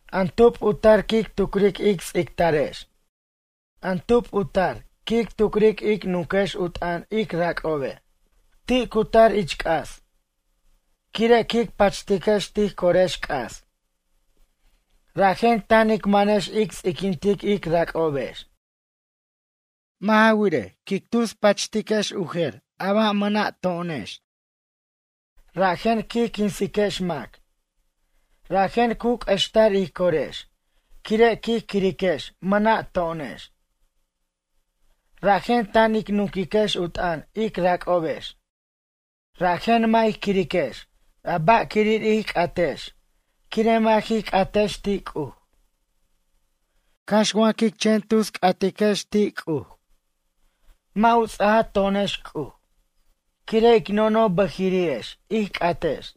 An tub u tar quic tucric ic ts'ictarex? An tub u tar quic tucric ic nunquex u t'ʌn ic rac'obe'. Ti' cu tar ich c'as. Quire' quic pachtiquex tij corex c'as. Rajen tan ic manex ic ts'iquint ic rac'obex. Mʌ' ja wirej, quic tus pachtex u jer a ba' mʌna' to'onex. Rajen quij quinsiquex mac. Rajen cu q'uextar ij corex quire' quij quiriquex mʌna' to'onex. Rajen tan ic nunquiquex u t'ʌn ic rac'obex. Rajen mʌ' ij quiriquex a ba'quirir ij c'atex quire' mʌ' jij c'atex ti' C'uj. Cax wa quic chen tus c'atex ti' C'uj. Mʌ' u ts'aja to'onex C'uj, quire' ic nonoj bʌjiri'ex ij c'atex.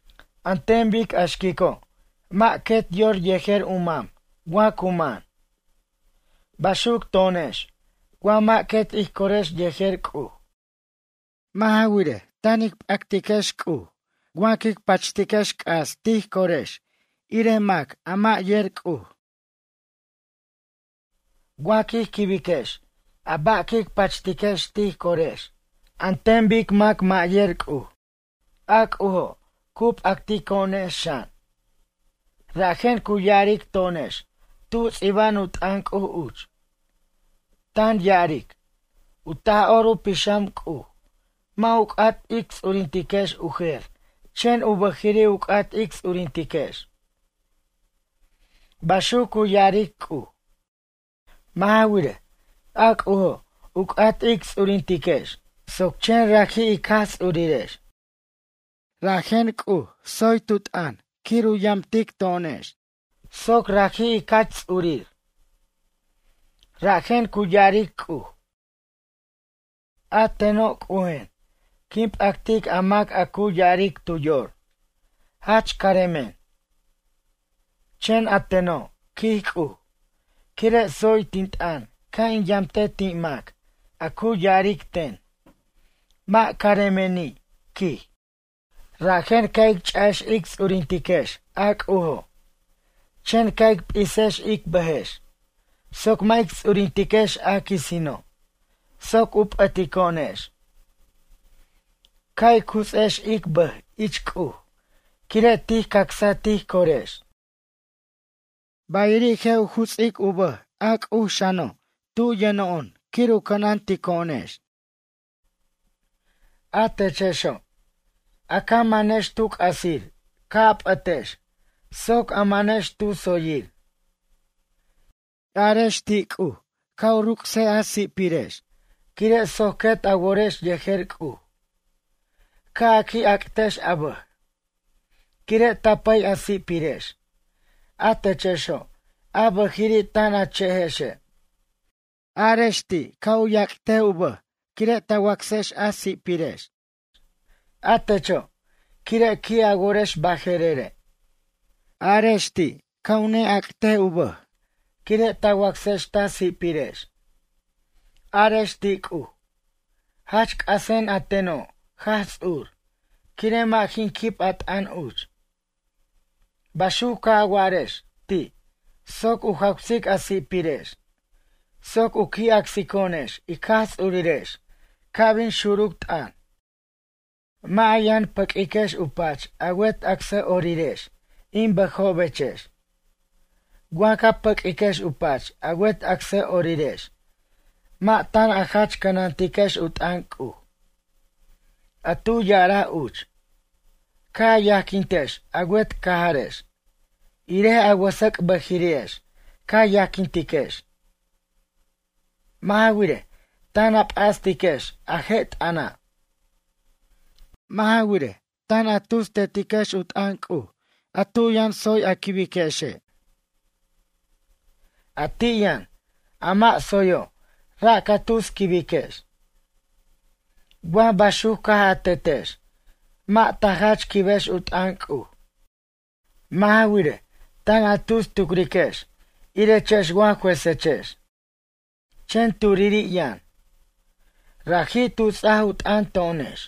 An ten bic a xquico' mʌ' quet yor yejer u mam wa cu man. Baxuc to'onex wa mʌ' quet ij corex yejer C'uj. Mʌ' ja wirej, tan ic p'actex C'uj wa quic pachtex c'as tij corex ir mac a mʌ' yer C'uj. Wa quij quibiquex a ba' quic pachtiquex tij corex an ten bic mac mʌ' yer C'uj. A C'ujo', cu p'actico'onex xan. Rajen cu ya'aric to'onex tu ts'iba'an u t'ʌn C'uj uch. Tan ya'aric: “U Taj'or u Pixam C'uj, mʌ' u c'at ic ts'urintiquex u jer chen u bʌjiri' u c'at ic ts'urintiquex.” Baxuc cu ya'aric C'uj. Mʌ' ja wirej, a C'ujo' u c'at ic ts'urintiquex soc chen raji' ic Jaj Ts'urirex. Rajen C'uj tsoy tu t'ʌn quir u yamtic to'onex soc raji' ic jach ts'urir. Rajen cu ya'aric C'uj: “A teno' C'ujen quin p'actic a mac a cu ya'aric tu yor: Jach caremen. Chen a teno', quij C'uj, quire' tsoy tin t'ʌn ca' in yamte ti' mac a cu ya'aric ten: Mʌ' caremeni', quij.” Rajen ca' ic cha'ex ic ts'urintiquex a C'ujo', chen ca' ic p'isex ic bʌjex soc mʌ' ic ts'urintiquex a quisino', soc u p'ʌtico'onex. Ca' ic juts'ex ic bʌj ich C'uj quire' tij cacsa tij corex. Bayiri' je' u juts'ic u bʌj a C'uj xano' tub yʌno'on quir u cʌnantico'onex. A techexo', a ca manex tu c'asir ca' a p'ʌtex soc a manex tu tsoyir. Arex ti' C'uj ca' u ruc's a si'pirex quire' soc quet a worex yejer C'uj. Ca' a qui' ac'tex a bʌj, quire' ta pʌy a si'pirex, a techexo' a bʌjiri' tan a che'ejexe'. Arex ti' ca' yac'tex u bʌj quire' ta wacsex u si'pirex. A techo' quire' qui' a worex baje'rere'. Arex ti', ca' neyac'tex u bʌj quire' ta wacsex ta si'pirex. Arex ti' C'uj: “Jach c'asen a teno' Jaj Ts'ur quire' mʌ' jin quib a t'ʌn uch.” Baxuc ca' a warex, ti', soc u jawsic a si'pirex soc u qui' acsico'onex ic Jaj Ts'urirex ca' bin xuruc t'ʌn. Mʌ' a yʌn pʌq'uiquex u pach a wet acsʌ'orirex in bʌjobechex. Wa ca paq'uiquej u pach a wet acsʌ'orirex mʌ' tan a jach cʌnantiquex u t'ʌn C'uj. A tu ya'araj uch: “Ca' a yajquintiquex a wet cajarex, irej a wʌsʌc' bʌjiri'ex ca yajquintiquex.” Mʌ' ja wirej, tan a p'astiquex a je' t'ʌna'. Mʌ' ja wirej, tan a tus tetiquex u t'ʌn C'uj a tu yʌn tsoy a quibiquexe'. A ti' yʌn, a mʌ' tsoyo' ra' ca tus quibiquex. Wa baxuc caj a tetex mʌ' ta jach quibex u t'ʌn C'uj. Mʌ' ja wirej, tan a tus tucriquex irechex wa juesechex. Chen turiri' yʌn. Raji' tu ts'aj u t'ʌn to'onex.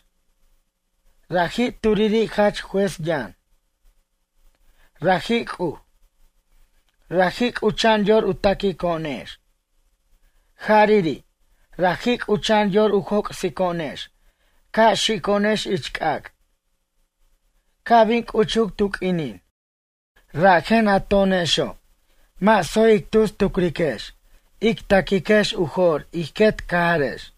Raji' turiri' Jach Juéz yʌn. Raji' C'uj. Raji' c'ucha'an yor u taquico'onex. Jariri', raji' c'ucha'an yor u joc'sico'onex ca' xico'onex ich c'ac'. Ca' bin c'uchuc tu q'uinin. Rajen a to'onexo' mʌ' tsoy ic tus tucriquex ic ta'quiquex u jo'r ij quet cajarex.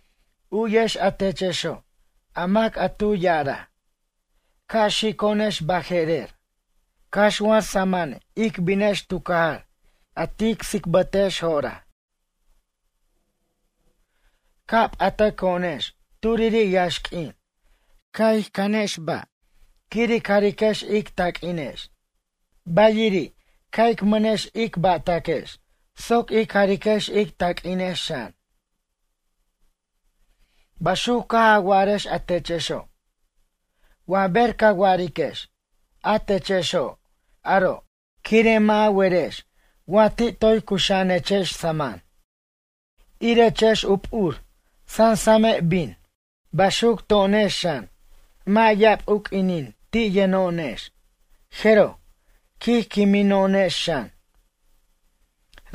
U'yex a techexo', a mac a tu ya'araj: “Ca' xico'onex baje'rer, cax wa samʌn ic binex tu cajar a tic tsicbatex jo'oraj.” Ca' p'atʌco'onex turiri' yaxq'uin ca' ic cʌnjex ba', quir ic jariquex ic taq'uinex. Bayiri' ca' ic mʌnex ba'taquex soc ic jariquex ic taq'uinex xan. Baxuc caj a wa'arex a techexo'. Wa ber ca wa'ariquex a techexo' aro', quire' mʌ' a werex wa ti' toy cuxa'anechex samʌn. Irechex u p'ur, sansame' bin. Baxuc to'onex xan mʌ' ya'ab u q'uinin ti' yʌno'onex jeroj, quij quimino'onex xan.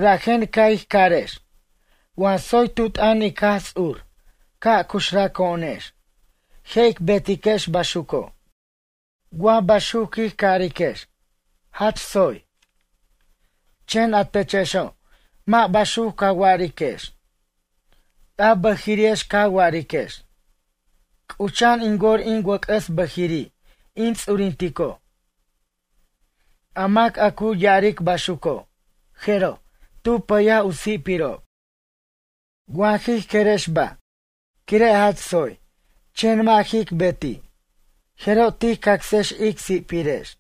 Rajen ca' ij carex, wa tsoy tu t'ʌn ic Jaj Ts'ur ca' cuxraco'onex je' ic betiquex baxuco'. Wa baxuc quij cariquex, jach tsoy. Chen a techexo' mʌ' baxuc ca wa'ariquex. A bʌjiri'ex ca wa'ariquex: “C'ucha'an in wor in wʌc'ʌs bʌjiri' in ts'urintico'.” A mac a cu ya'aric baxuco', jeroj, tu pʌyaj u si'pirob. Wa jij querex ba' quire' jach tsoy chen mʌ' jic beti' jeroj tij cacsex ic si'pirex.